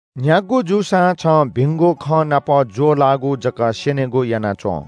न्‍ह्यागु जूसां छं भिंगु खँ नाप ज्‍वःलाःगु जक स्‍यनेगु याना च्‍वँ।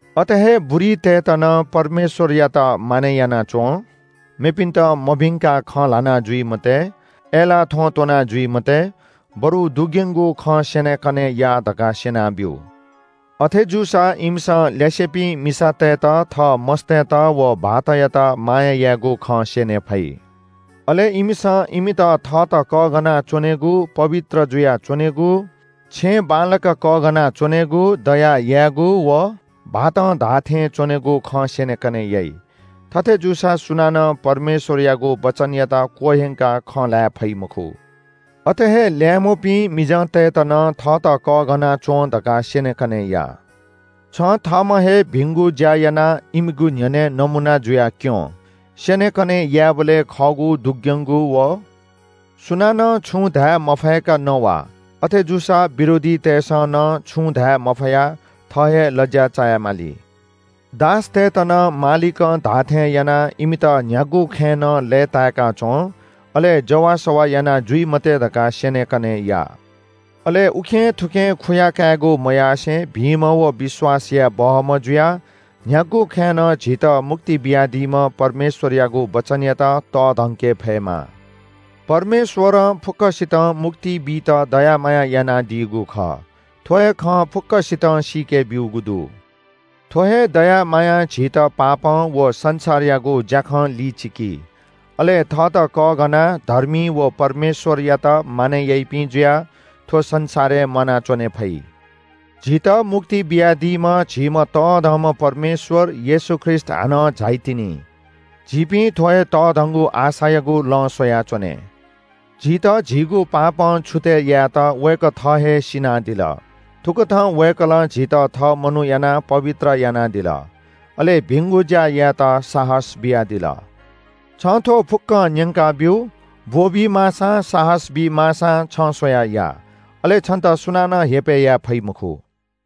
अथे हे बुरीतय्‌त नं परमेश्‍वरयात मानय् याना च्‍वँ, मेपिन्‍त मभिंकाः खँ ल्‍हाना जुइ मते, अय्‌लाः थ्‍वँ त्‍वनाजुइ मते, बरु दुग्‍यंगु खँ स्‍यनेकने या धकाः स्‍यना ब्‍यु। अथे जूसा इमिसं ल्‍यासेपिं मिसातय्‌त थः मस्‍तय्‌त व भाःतयात माया यायेगु खँ स्‍यने फइ। अले इमिसं इमित थःत कःघाना च्‍वनेगु, पवित्र जुयाच्‍वनेगु, छेँ बांलाक कःघाना च्‍वनेगु, दया यायेगु व भाःतं धाःथें च्‍वनेगु खँ स्‍यनेकने याइ। थथे जूसा सुनानं परमेश्‍वरयागु वचनयात क्‍वह्यंकाः खँ ल्‍हाये फइ मखु। अथे हे ल्‍याय्‌म्‍हपिं मिजंतय्‌त नं थःत कःघाना च्‍वँ धकाः स्‍यनेकने या। छं थःम्‍हं हे भिंगु ज्‍या यानाः इमिगु न्‍ह्यःने नमूना जुयाः क्‍यँ। स्‍यनेकने यायेबलय् खःगु, दुग्‍यंगु व सुनानं छुं धाये मफय्‌क नवा। अथे जूसा विरोधीतय्‌सं नं छुं धाये मफयाः थः हे लज्‍या चाये माली। दासतय्‌त नं मालिकं धाःथें यानाः इमित न्‍ह्यागु खँय् नं लय्‌ताय्‌का च्‍वँ, अले जवाःसवाः याना जुइ मते धकाः स्‍यनेकने या। अले उखेंथुखें खुयाकायेगु मयासें भिंम्‍ह व विश्‍वास याये बहःम्‍ह जुयाः न्‍ह्यागु खँय् नं झीत मुक्ति बियादीम्‍ह परमेश्‍वरयागु वचनयात तःधंके फयेमा। परमेश्‍वरं फुक्‍कसितं मुक्ति बीत दया माया यानादीगु खः। थ्‍व हे खँ फुक्‍कसितं सीके ब्‍यूगु दु। थ्‍व हे दया मायां झीत पापं व संसारयागु ज्‍याखं लिचिकी, अले थःत कःघानाः धर्मी व परमेश्‍वरयात मानय् याइपिं जुयाः थ्‍व संसारय् म्‍वानाच्‍वने फइ। झीत मुक्ति बियादीम्‍ह, झीम्‍ह तःधंम्‍ह परमेश्‍वर येशू ख्रीष्‍ट हानं झाइतिनि। झीपिं थ्‍व हे तःधंगु आशायागु लँ स्‍वयाच्‍वने। झीत झीगु पापं छुतय् यायेत वय्‌कः थः हे सिनादिल। थुकथं वय्‌कलं झीत थः मनू यानाः पवित्र यानादिल, अले भिंगु ज्‍या यायेत साहस बियादिल। छं थ्‍व फुक्‍कं न्‍यंकाब्‍यु। ब्‍वःबी माःसां साहस बी माःसां छं स्‍वयाः या। अले छन्‍त सुनानं हेपय् याये फइ मखु।